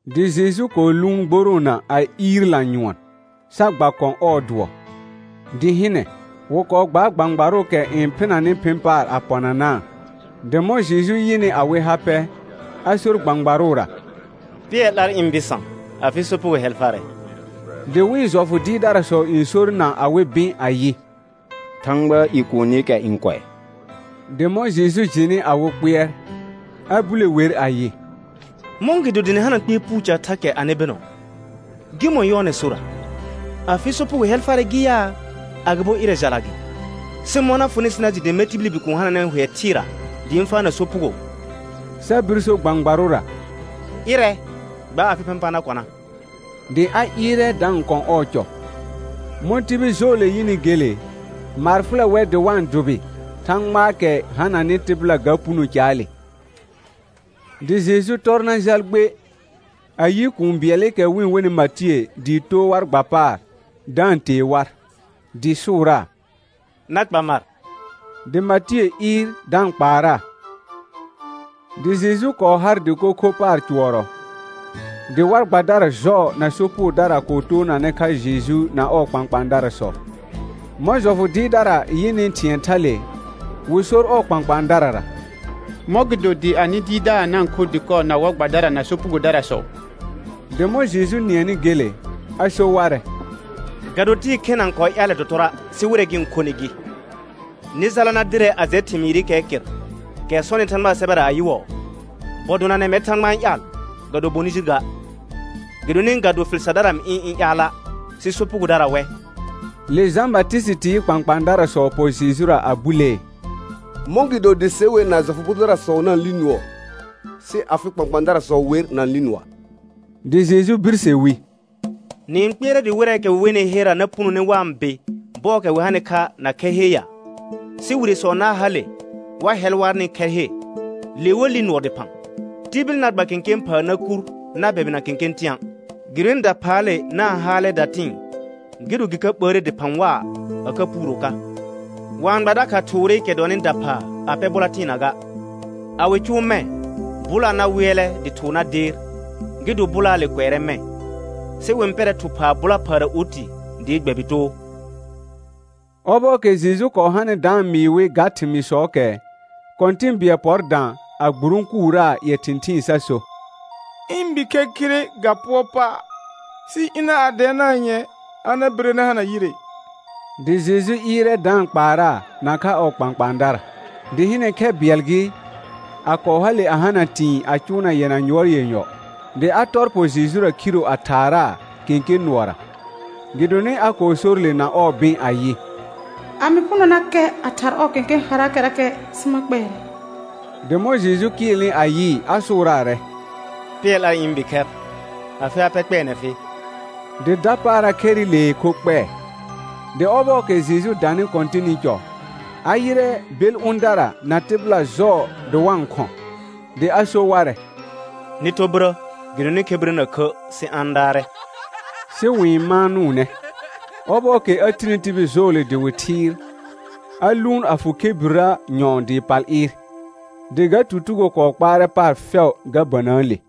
Dɩ Jeju kɔɔ lʋʋn gboroona a iir lanyʋɔn, sa gba kɔ̃ ɔɔ dʋɔ. Dɩ hɩnɛ, wɩ kɔɔ gbaar gbãgbarʋʋkɛ n phɩnanɩ phɩ̃ paar a pɔnanaa. Dɩ mɔ̃ Jeju yɩnɩ awɩ ha pɛ, a sor gbãgbarʋra: Pɩɛr 'lar ɩ̃ bɩsã, afɩ sopugo hɛl farɛ. Dɩ wɩ̃ jɔfʋ dɩɩrdarasɔ n sor na awɩ bɩ̃ ayɩ: Thãgbaa i kuunikɛ n kʋɛ. Dɩ mɔ̃ Jeju jɩnɩ awɩ kpɩɛr, a bule wer ayɩ: Mɔ̃gɩdo dɩ nɩ hana kpɩɛr puu thakɛ anɩ bɩnɔ? Gɩmɔ̃ yɔɔnɛ sorra: Afɩ sopugo hɛl farɛ gɩ yaa, agɩbo ɩrɛ jala gɩ? Sɩ mɔ̃ na fʋnɩ sɩ na jɩ, dɩ mɛr tibili Bikuun hananɛ hʋɛ thɩɩra dɩ ɩ̃ faana sopugo, sa bir so gbãgbarʋra: Ɩrɛ, gba afɩ phɩ̃ pa na kɔna. Dɩ a ɩɩrɛ da-n kɔ̃ ɔɔ cɔ. Mɔ̃ tibil jɔɔle yɩnɩ gele, maar fʋlɛ wɛr dɩ wa-n dʋbɩ Thãgbaakɛ hananɩ tɩbɩla ga puno caale. Dɩ Jeju tɔr na jal gbe, a yɩ kũu bɩɛlɩkɛ wɩ-n wenɩ Matiə dɩ too war gba paar da-n tee war, dɩ sʋʋraa: Na kpa mar. Dɩ Matiə ɩɩr da-n kpaaraa. Dɩ Jeju kɔɔ har dɩko kho paar cʋɔrɔ, dɩ war gbadara jɔɔ na sopugodara kɔɔ toonanɛ kha Jeju na ɔɔ kpãkpãadarasɔ. Mɔ̃ jɔfʋ dɩɩrdara yɩnɩ thɩ̃ɛ thale, wɩ sor ɔɔ kpãkpãadarara: Mɔ̃gɩdo dɩ anɩ dɩɩrdaar na-n kho dɩkɔ na war gbadara na sopugodarasɔ? Dɩ mɔ̃ Jeju nɩɛnɩ gele, a so warɛ: Ga do tɩɩ khena n kɔɔ ƴaalɛ dɔtɔrɔa', sɩ wɩrɛ gɩ-n khonɩ gɩ. Nɩ jala na dɩrɛ a jɛ thɩmɩɩrɩkɛɛ kɩr, kɛ sɔnɩ Thãgbaa sɛbɛra ayɩwɔɔ: «Bɔ donanɛ mɛr Thãgba n ƴaal, ga do bonɩ jir ga.» Gɩdonɩ ga do fɩl sardara mɩ ɩ̃ ɩ̃ ƴaala', sɩ sopugodara wɛ. Le Jã Batɩsɩtɩɩ kpãkpãadarasɔ pɔ Jejura a bulee: Mɔ̃gɩdo dɩ se wer na jɔfʋ bʋ dʋdarasɔ na-n li nʋɔ, sɩ afɩ kpãkpãadarasɔ wer na-n li nʋɔa'. Dɩ Jeju birse wi: Nɩ-n kpɩɛrɛ dɩ wɩrɛɛkɛ wɩ wenɩ herra na punone wa-n bɩ bɔɔkɛ wɩ hanɩ kha na khɛr he ya? Sɩ wiresɔ na hale wa hɛl warnɩ khɛr he. Le wa li nʋɔ dɩphã. Tibil na gba kẽkẽ phaa na kur na bɛbɩna kẽkẽ tɩ̃a', gɩdonɩ daphaale na-n haalɛ datɩ̃ɩ, gɩ do gɩ ka ɓəəre dɩphã waa a ka puuro ka. Wa-n gba dakha thʋʋrɩkɛ dɔnɩ daphaa a pɛ bʋla tɩɩna ga. A wɩ cʋʋ mɛ̃, bʋlaa na wɩɛlɛ dɩ thʋʋr na deer, gɩ do bʋlaale kʋɛrɛ mɛ̃. Sɩ wɩ-n pɛr thʋ phaa bʋla phaara oti dɩɩ gbɛbɩ too. Ɔbɔɔkɛ Jeju kɔɔ hanɩ da-n mɩɩ wɩ ga thɩmɩɩsɔɔkɛ, kɔ̃tɩ̃ bɩɛl pɔr dã a gburõkuraa ƴɛ thɩ̃thɩɩn sa so: Ɩ̃ bikhɛr khire ga pʋɔr pa', sɩ ɩna a dɛɛnaa nyɛ̃ɛ a na bɩre na hana yɩre. Dɩ Jeju ɩɩrɛ da-n kpaaraa nakha ɔɔ kpãkpãadara. Dɩ hɩnɛ khɛ bɩɛl gɩ, a kɔɔ hale a hana tɩ̃ɩ a cʋʋna yɛna yuɔr yenyɔ, dɩ a tɔr pɔ Jejura khiro a thaaraaa kẽkẽ nʋɔra. Gɩdonɩ a kɔɔ sor le na ɔɔ bɩ̃ ayɩ: A mɩ punonakɛ a thar ɔɔ kẽkẽ haraakɛrakɛ sɩ ma kpɛɛrɛ. Dɩ mɔ̃ Jeju kɩɩlnɩ a yɩɩ a sʋʋraarɛ: Pɩɛr 'lar ɩ̃ bikhɛr, afɩ ha pɛ kpɛɛnɛ fɩ; dɩ dapaara khɛrɩlee kho kpɛɛ. Dɩ ɔbɔɔkɛ Jeju danɩ kɔ̃tɩnɩ cɔ, a yɩrɛ bel ʋ̃dara na tɩbɩla jɔɔ dɩ wa-n khɔ̃, dɩ a so warɛ: Nɩ tɔ birə gɩdonɩ khebirrə na khə', sɩ a-n daarɛ; sɩ wɩ-n maanʋʋnɛ. Ɔbɔɔkɛ a tini tibil jɔɔle dɩ wɩ thɩɩr, a lʋʋn a fʋ khebirrə nyɔ̃ɔ dɩ pal ɩɩr. Dɩ ga tutugo kɔɔ kpaarɛ paar fɛʋ ga bənəəle.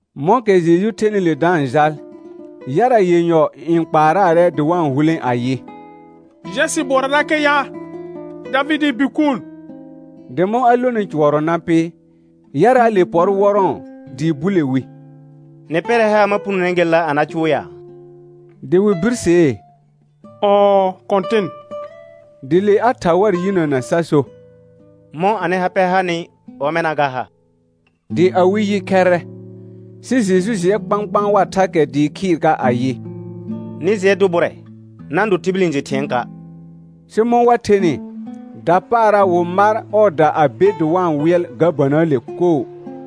Mɔ̃kɛ Jeju thenɩ le da-n jal, yara yenyɔ n kpaaraarɛ dɩ wa-n hulẽ ayɩ: Jɛ sɩ bʋɔrarakɛ ya, Davɩdɩɩ Bikuun. Dɩ mɔ̃ a lonɩ cʋɔrɔ na pɩ, yaraale pɔr wɔrɔ̃ɔ dɩ bule wi: Nɩ pɛrɛ haar ma punone gelela a na cʋʋ ya? Dɩ wɩ birsee: Ɔɔ, Kɔ̃tɩn. Dɩ le a tha war yinəna sa so: Mɔ̃ anɩ ha pɛ hanɩ, ɔmɛna ga ha. Dɩ awɩ yi khɛrrɛ. Sɩ Jeju jɩɛ kpãkpãa war thakɛ dɩɩ khɩɩr ka ayɩ: Nɩ jɩɛ dʋ bʋrɛ, na-n do tibil n jɩ thɩ̃ɛɛka'; sɩ mɔ̃ wa thenɩ, dapaara wɩ mar ɔɔda a be dɩ wa-n wɩɛl ga bənəəle koo.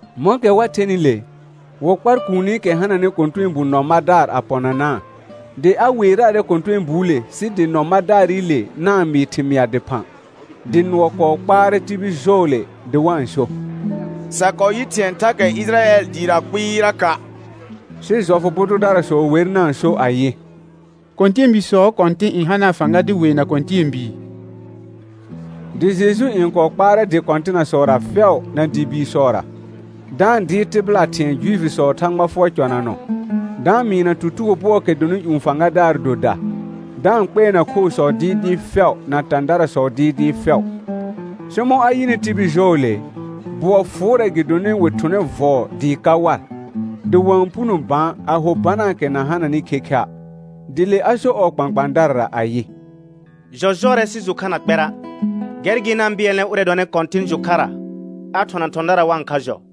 Mɔ̃kɛ wa thenɩ le, wɩ kpar kuunikɛ hananɩ kɔ̃tɛɛbu nɔ madaar a pɔnanaa. Dɩ a weeraarɛ kɔ̃tɛɛbuule sɩ dɩ nɔ madaarɩle na-n mɩɩ thɩmɩa dɩphã. Dɩ nʋɔ kɔɔ kpaarɛ tibil jɔɔle dɩ wa-n so: Sa kɔɔ yɩ thɩ̃ɛ thakɛ Ɩjɩrayɛl dɩɩra kpɩɩraka'. Sɩ jɔfʋ bʋ dʋdarasɔ wer na-n so ayɩ: Kɔ̃tɛɛbiisɔɔ kɔ̃tɩ̃ n hanaa fãga dɩ weena kɔ̃tɛɛbii. Dɩ Jeju n kɔɔ kpaarɛ dɩ kɔ̃tɩnasɔra fɛʋ na dɩ biisɔra, da-n dɩɩr tɩbɩla thɩ̃ɛ Juifisɔɔ Thãgba fʋɔr cɔnanɔ, da-n mɩɩna tutugo bʋɔɔkɛ dɔnɩ ƴũ fãgadaar doda, da-n kpɛɛna khoosɔ dɩɩdɩɩ fɛʋ na tãdarasɔ dɩɩdɩɩ fɛʋ. Sɩ mɔ̃ a yɩnɩ tibil jɔɔle, bʋɔ fʋʋrɛ gɩdonɩ wɩ thʋnɛ vɔɔ dɩɩ ka war, dɩ wa-n puno bã a ho banaakɛ na hananɩ khekha'. Dɩ le a so ɔɔ kpãkpãadarara ayɩ: Jɔ jɔrɛ, sɩ jʋ kha na kpɛra'. Gɛr gɩ na-n bɩɛlnɛ ʋrɛ dɔnɩ Kɔ̃tɩn jʋ kharra a thɔna thɔ̃dara wa-n kha jɔ.